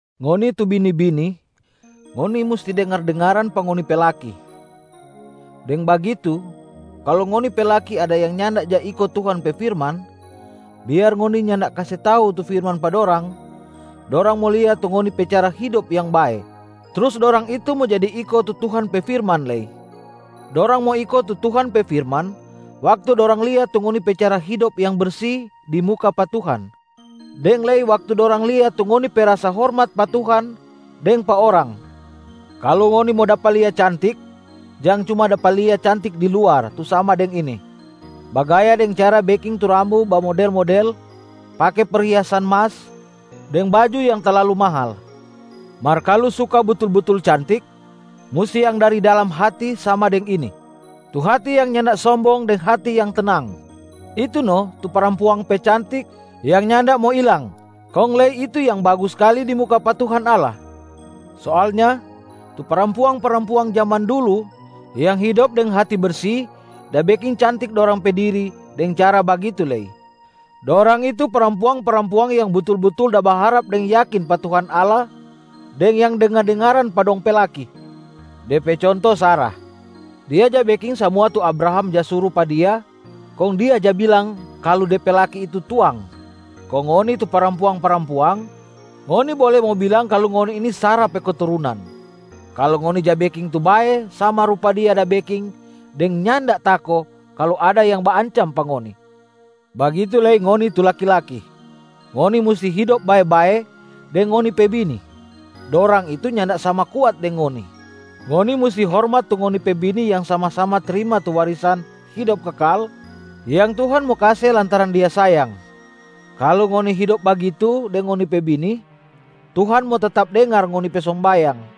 Ngoni tu bini-bini, ngoni musti dengar-dengaran pa ngoni pe laki. Deng bagitu, kalu ngoni pe laki ada yang nyanda ja iko Tuhan pe firman, biar ngoni nyanda kase tau tu firman pa dorang, dorang mo lia tu ngoni pe cara hidop yang bae, trus dorang itu mo jadi iko tu Tuhan pe firman lei. Dorang mo iko tu Tuhan pe firman waktu dorang lia tu ngoni pe cara hidop yang bersi di muka pa Tuhan, deng lei waktu dorang lia tu ngoni pe rasa hormat pa Tuhan deng pa orang. Kalu ngoni mo dapa lia cantik, jang cuma dapa lia cantik di luar tu sama deng ini: bagaya deng cara beking tu rambu bamodel-model, pake perhiasan mas deng baju yang talalu mahal. Mar kalu suka butul-butul cantik, musti yang dari dalam hati sama deng ini: tu hati yang nyanda sombong deng hati yang tenang. Itu no tu parampuang pe cantik yang nyanda mo ilang kong lei itu yang bagus skali di muka pa Tuhan Allah. Soalnya tu parampuang-parampuang jaman dulu yang hidop deng hati bersi da beking cantik dorang pe diri deng cara bagitu lei. Dorang itu parampuang-parampuang yang butul-butul da baharap deng yakin pa Tuhan Allah deng yang dengar-dengaran pa dong pe laki. De pe conto Sara. Dia ja beking samua tu Abraham ja suru pa dia kong dia ja bilang kalu de pe laki itu tuang. Kong ngoni tu parampuang-parampuang, ngoni bole mo bilang kalu ngoni ini Sara pe keturunan kalu ngoni ja beking tu bae sama rupa dia da beking deng nyanda tako kalu ada yang baancam pa ngoni. Bagitu lei ngoni tu laki-laki, ngoni musti hidop bae-bae deng ngoni pe bini, dorang itu nyanda sama kuat deng ngoni. Ngoni musti hormat tu ngoni pe bini yang sama-sama trima tu warisan hidop kekal yang Tuhan mo kase lantaran Dia sayang. Kalu ngoni hidop bagitu deng ngoni pe bini, Tuhan mo tetap dengar ngoni pe sombayang.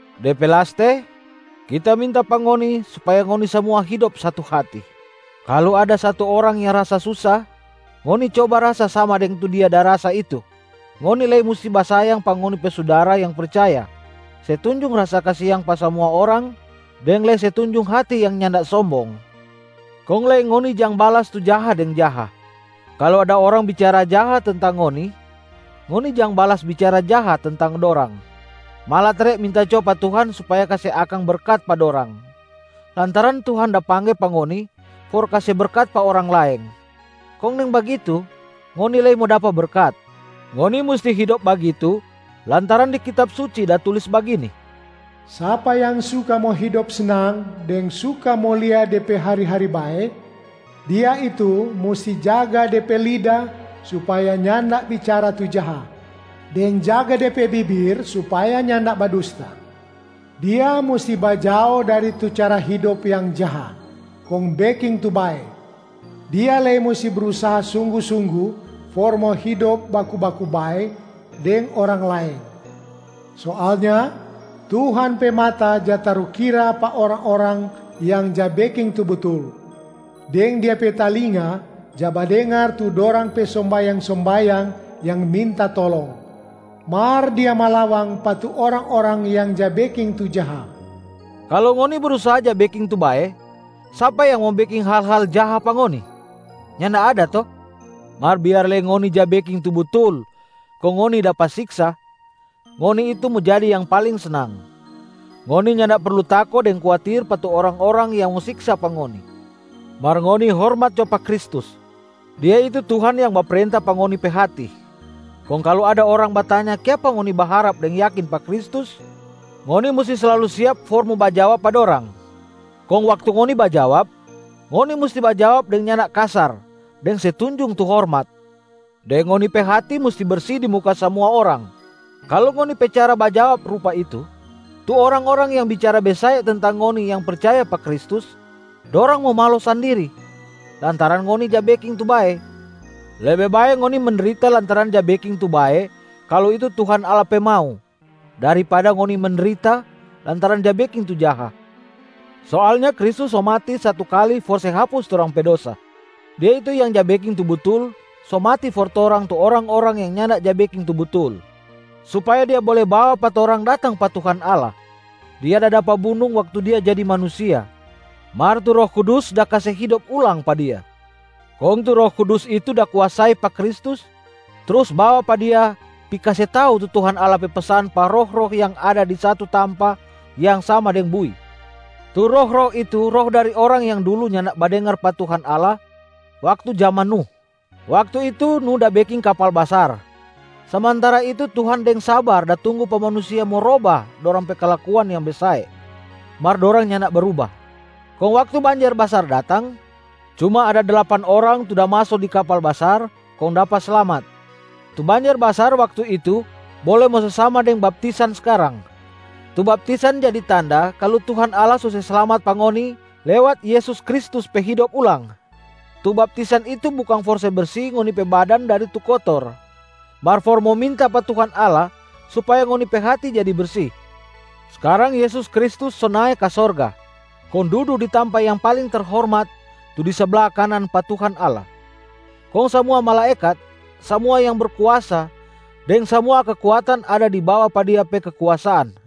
De pe laste, kita minta pa ngoni supaya ngoni samua hidop satu hati. Kalu ada satu orang yang rasa susa, ngoni coba rasa sama deng tu dia da rasa itu. Ngoni lei musti basayang pa ngoni pe sudara yang percaya, se tunjung rasa kasiang pa samua orang, deng lei se tunjung hati yang nyanda sombong. Kong lei ngoni jang balas tu jaha deng jaha. Kalu ada orang bicara jaha tentang ngoni, ngoni jang balas bicara jaha tentang dorang. Malatare minta jo pa Tuhan supaya kase akang berkat pa dorang, lantaran Tuhan da pangge pa ngoni for kase berkat pa orang laeng, kong deng bagitu ngoni lei mo dapa berkat. Ngoni musti hidop bagitu lantaran di Kitab Suci da tulis bagini, “Sapa yang suka mo hidop snang deng suka mo lia de pe hari-hari bae, dia itu musti jaga de pe lida supaya nyanda bicara tu jaha, deng jaga de pe bibir supaya nyanda badusta. Dia musti bajao dari tu cara hidop yang jaha, kong beking tu bae. Dia lei musti brusaha sunggu-sunggu for mo hidop baku-baku bae deng orang laeng. Soalnya Tuhan pe mata ja tarukira pa orang-orang yang ja beking tu butul, deng Dia pe talinga ja badengar tu dorang pe sombayang-sombayang yang minta tolong. Mar Dia malawang pa tu orang-orang yang ja beking tu jaha.” Kalu ngoni brusaha ja beking tu bae, sapa yang mo beking hal-hal jaha pa ngoni? Nyanda ada to? Mar biar lei ngoni ja beking tu butul kong ngoni dapa siksa, ngoni itu mo jadi yang paling snang. Ngoni nyanda perlu tako deng kuatir pa tu orang-orang yang mo siksa pa ngoni. Mar ngoni hormat jo pa Kristus, Dia itu Tuhan yang baprenta pa ngoni pe hati. Kong kalu ada orang batanya kiapa ngoni baharap deng yakin pa Kristus, ngoni musti slalu siap for mo bajawab pa dorang. Kong waktu ngoni bajawab, ngoni musti bajawab deng nyanda kasar deng se tunjung tu hormat, deng ngoni pe hati musti bersi di muka samua orang. Kalu ngoni pe cara bajawab rupa itu, tu orang-orang yang bicara besae tentang ngoni yang percaya pa Kristus, dorang mo malo sandiri lantaran ngoni ja beking tu bae. Lebe bae ngoni mendrita lantaran ja beking tu bae kalu itu Tuhan Allah pe mau, daripada ngoni mendrita lantaran ja beking tu jaha. Soalnya Kristus so mati satu kali for se hapus torang pe dosa. Dia itu yang ja beking tu butul so mati for torang tu orang-orang yang nyanda ja beking tu butul, supaya Dia bole bawa pa torang datang pa Tuhan Allah. Dia da dapa bunung waktu Dia jadi manusia, mar tu Roh Kudus da kase hidop ulang pa Dia. Kong tu Roh Kudus itu da kuasai pa Kristus trus bawa pa Dia pi kase tau tu Tuhan Allah pe pesan pa roh-roh yang ada di satu tampa yang sama deng bui. Tu roh-roh itu roh dari orang yang dulu nyanda badengar pa Tuhan Allah waktu jaman Nuh. Waktu itu Nuh da beking kapal basar, samantara itu Tuhan deng sabar da tunggu pa manusia mo roba dorang pe kalakuan yang besae, mar dorang nyanda bruba. Kong waktu banjer basar datang, cuma ada dlapan orang tu da maso di kapal basar kong dapa slamat. Tu banjer basar waktu itu bole mo se sama deng baptisan skarang. Tu baptisan jadi tanda kalu Tuhan Allah so se slamat pa ngoni lewat Yesus Kristus pe hidop ulang. Tu baptisan itu bukang for se bersi ngoni pe badan dari tu kotor, mar for mo minta pa Tuhan Allah supaya ngoni pe hati jadi bersi. Skarang Yesus Kristus so nae ka sorga kong dudu di tampa yang paling terhormat tu di sabla kanan pa Tuhan Allah. Kong samua malaekat, samua yang berkuasa deng samua kekuatan ada di bawa pa Dia pe kekuasaan.